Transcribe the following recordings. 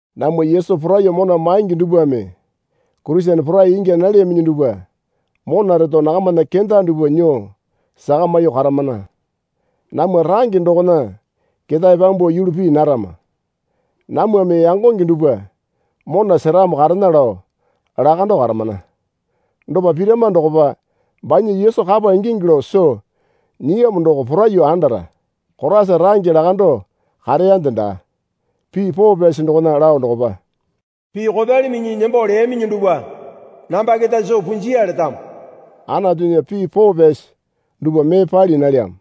Namwa Yesu poraiyuo mona maingi dupwame Kurisene porai ingya nalyaminyi dupwa mona reto nakamana kenda dupwa nyuo sakamyuo karamana. Namwa range dokona ketae pyambuo yulu pii narama. Namwame yangonge dupwa mona seramo karena lao lakando karamana. Dopa pirama dokopa banya Yesu kapa ingingi lao soo nyiyamo doko poraiyuo andara. Koraisa range lakando kareyande daa. Pii poo pyasi dokona lao dokopa, Pii kopyali minyinyi nembo leyaminyi dupwa namba keta soo punjiya letamo. Anatunya pii poo pyasi dupwa mee pali nalyamo.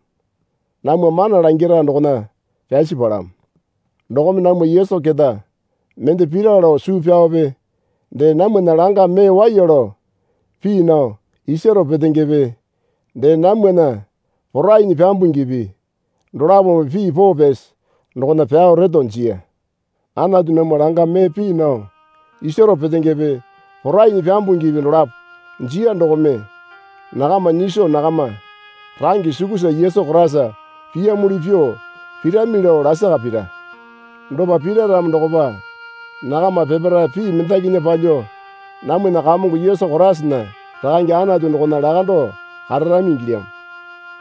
Namwa mana langira dokona pyasi palamo. Dokome namwa Yesu keta mende pira lao suu pyaope dee namwana langa mee waiya lao pii nao isaro petengepe dee namwana porainyi pyambungipi dolapome pii poo pyasi dokona pyao reto jiya. Anatu namwa langa mee pii nao isaro petengepe porainyi pyambungipi dolapo jiya dokome nakama nyiso nakama range sukusa Yesu Koraisa piyamuli pyuo pirami lao lasaka pira. Dopa pira ramo dokopa nakama peparae pii mendakinya palyuo namwana Kamongo Yesu Koraisana Rakange Anatu dokona lakando kararami ingilyamo.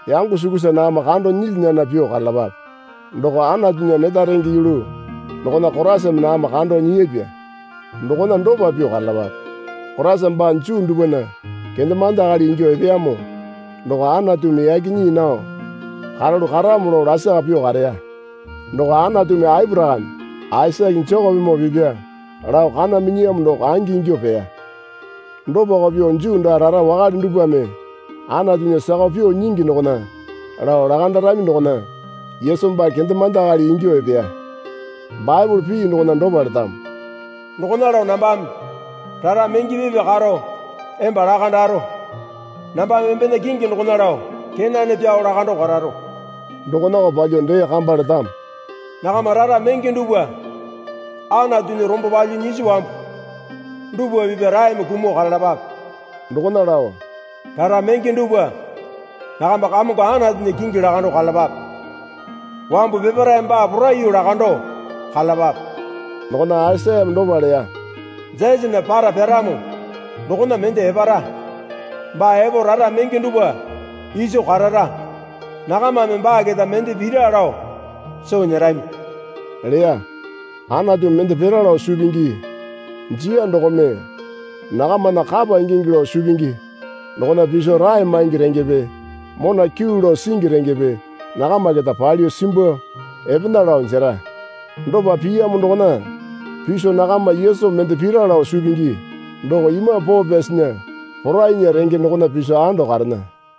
Yango sukusa nakama kando nyilya nana pyuo karalapape. Doko Anatunya neta renge yulu dokona Koraisame nakama kando nyiyapya dokona dopa pyuo karalapape. Koraisana baa Juu dupwana kendemande akali ingyuo epeyamo doko Anatumi yaki nyii nao karalu karamo lao lasaka pyuo kareya. Doko Anatumi Aporakame, Aisake, Jekopemoo pipya lao kana minyiyamo doko angi ingyuo peya. Dopako pyuo Juu daa rara wakale dupwame Antunya sakao pyuo nyingi dokona lao lakandarami dokona Yesu baa kendemande akali ingyuo epeya. Baepole pii dokona dopa letamo. Dokona lao nambame rara menge pipya karo emba lakandaro. Nambame embena kingi dokona lao kenane pyao lakando kararo. Dokonako palyuo dee kamba letamo. Nakama rara menge dupwa Anatunya rombo palyuo nyisi wambu dupwa piya raeme kumuo karalapape. Dokona lao, Rara menge dupwa nakama Kamongo Anatunya kingi lakando karalapape. Wambu peparae baa poraiyuo lakando karalapape. Dokona Aisayame dopa leya. Jesena para pyaramo dokona mende epara. Baa epo rara menge dupwa iso karara. Nakamame baa keta mende pira lao soo nyerami leya. Anatumi mende pira lao suu pingi jiya dokome nakamana kapa ingingi lao suu pingi dokona piso rae maingi rengepe mona kyuu lao singi rengepe nakama keta palyuo simbuo epena lao jera. Dopa piyamo dokona piso nakama Yesu mende pira lao suu pingi doko Imambu Poo Pyasinya porainya renge dokona piso ando karena.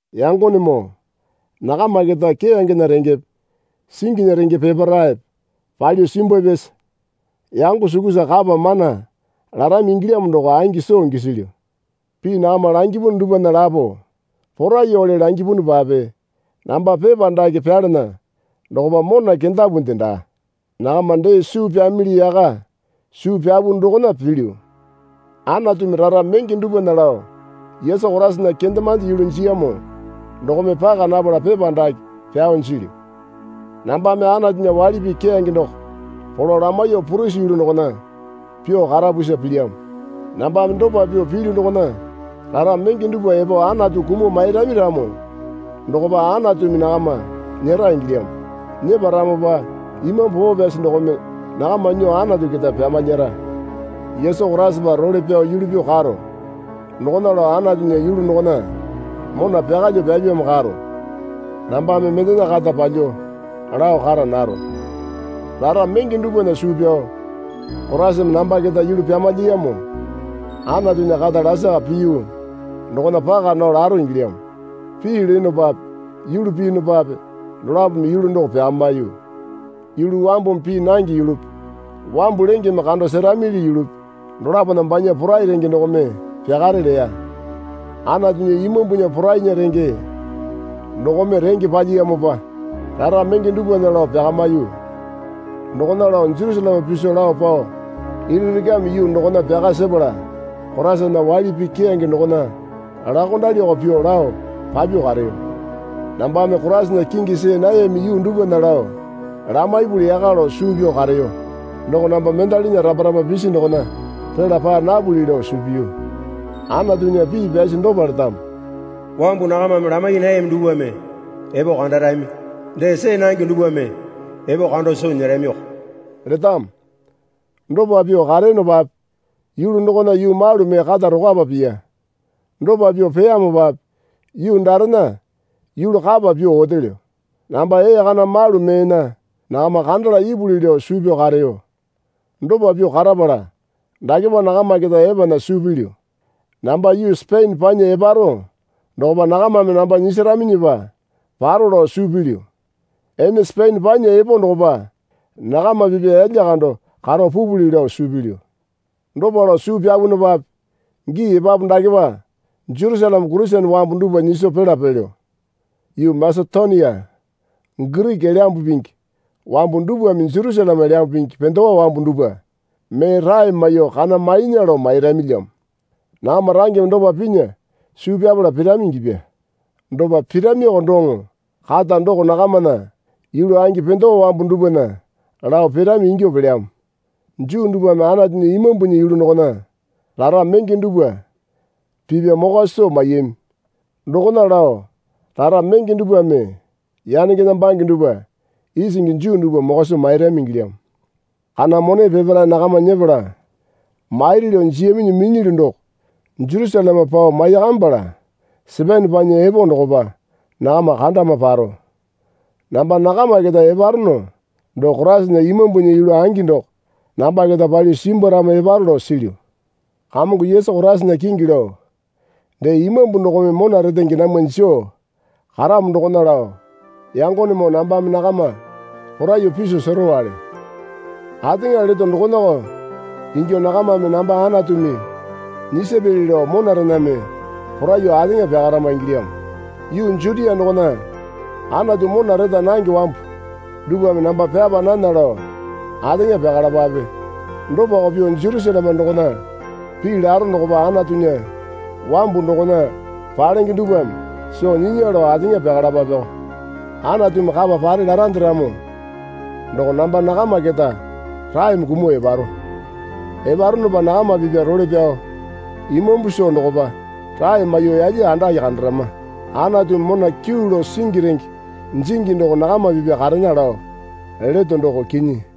Yangonemoo, nakama keta keyangena rengepe singinya renge peparaepe pali simbwapyasa yango sukusa kapa mana larami ingilyamo doko angi soo gisilyu. Pii nakama langipu dupwana lapo poraiyuwale langipunupape namba pepa dake pyalana dokopa mona kendapunde daa. Nakama dee suu pyamili yaka suu pyapu dokona pilyu. Anatumi rara menge dupwana lao Yesu Koraisana kendemande yulu jiyamo dokome paka napala pepa dake pyao jilyu. Nambame Anatunya waili pii keyange doko polo lamaiyuo purisi yulu dokona pyuo karapusa pilyamo. Nambame dopa pyuo pilyu dokona rara menge dupwa epo Anatu kumuo mairami ramo dokopa Anatumi nakama nyera ingilyamo. Nyeparamopa Imambu Poo Pyasi dokome nakama nyuo Anatu keta pyamalyara. Yesu Koraisapa role pyao yulu pyuo karo. Dokona lao Anatunya yulu dokona mona pyakalyuo pyapyamo karo. Nambame mendena kata palyuo lao kara naro. Rara menge dupwana suu pyao Koraisame namba keta yulu pyamalyiyamo Anatunya kata lasaka piyu dokona paka nao laro ingilyamo. Pii leyonopape yulu piyunupape dolapome yulu doko pyakamiyu. Yulu wambumi pii nange yulupi wambu lengeme kando seramili yulupi dolapona banya porai renge dokome pyakare leya. Anatunya Imambunya porainya renge dokome renge palyiyamopa rara menge dupwana lao pyakamiyu. Dokona lao Jerusaleme piso lao pao Ilirikame yuu dokona pyaka sepala Koraisana waili pii keyange dokona laokondaliko pyuo lao papyuo kareyo. Nambame Koraisana kingi see nayami yuu dupwana lao lamaipuli yaka lao suu pyao kareyo. Doko namba mendalena rapa rapa pisi dokona pela paa napuli lao suu piyu. Anatunya pii pyasi dopa letamo. Wambu nakamame lamai nayami dupwame epo kandarami, dee see nange dupwame epo kando soo nyeramiko letamo. Dopa pyuo kareyonopape yulu dokona yuu malu mee kata tokwapa piya. Dopa pyuo peyamopape yuu darena yulu kapa pyuo otelyo. Namba ee kana malu meena nakama kandala ipuli lao suu pyao kareyo. Dopa pyuo karapala, dakepa nakama keta epena suu pilyu. Namba yuu Sepene panya eparo dokopa nakamame namba nyisaraminyipa paro lao suu pilyu. Ene Sepene panya epo dokopa nakama pipya yalya kando karo pupuli lao suu pilyu. Dopa lao suu pyapunupape gii epapu dakepa Jerusaleme Kurisene wambu dupwa nyiso pila pelyo. Yuu Masetonia Giriki Elyambu Pingi wambu dupwame Jerusaleme Elyambu Pingi pendewa wambu dupwa mee rae maiyuo kana mainya lao mairamilyamo. Nakama rangeme dopa pinya suu pyapala pirami ingyapya. Dopa piramiko doŋo kata doko nakamana yulu angi pendewa wambu dupwana lao pirami ingyuo pelyamo. Juu dupwame Anatunya Imambunya yulu dokona rara menge dupwa pipya mokwa soo maiyami. Dokona lao rara menge dupwame yanengena bange dupwa isingi Juu dupwa mokwa soo mairami ingilyamo. Kana mone peparae nakama nyepala mairi lao jiyaminyi minyilyu doko Jerusaleme pao maiyakamipala Sepene panya epo dokopa nakama kandama paro. Namba nakama keta eparono doko Koraisana Imambunya yulu angi doko namba keta palyuo simbwaramo eparo lao silyu. Kamongo Yesu Koraisana kingi lao dee Imambu dokome mona retenge namwa joo karamo dokona lao yangonemoo nambame nakama poraiyuo piso serowale. Ateŋa leto dokonako ingyuo nakamame namba Anatumi nyisapyali lao monarename poraiyuo ateŋa pyakarama ingilyamo. Yuu Jutia dokona Anatu mona reta nange wambu dupwame namba pyapa nana lao ateŋa pyakalapape. Dopako pyuo Jerusaleme dokona pii laro dokopa Anatunya wambu dokona palenge dupwame soo nyinya lao ateŋa pyakalapapeko. Anatumi kapa pare larande ramo doko namba nakama keta raeme kumuo eparo. Eparonopa nakama pipya role pyao imambu soo dokopa rae maiyuo yalya andake kandarama. Anatumi mona kyuu lao singi renge jingi doko nakama pipya karena lao leto doko kinyi.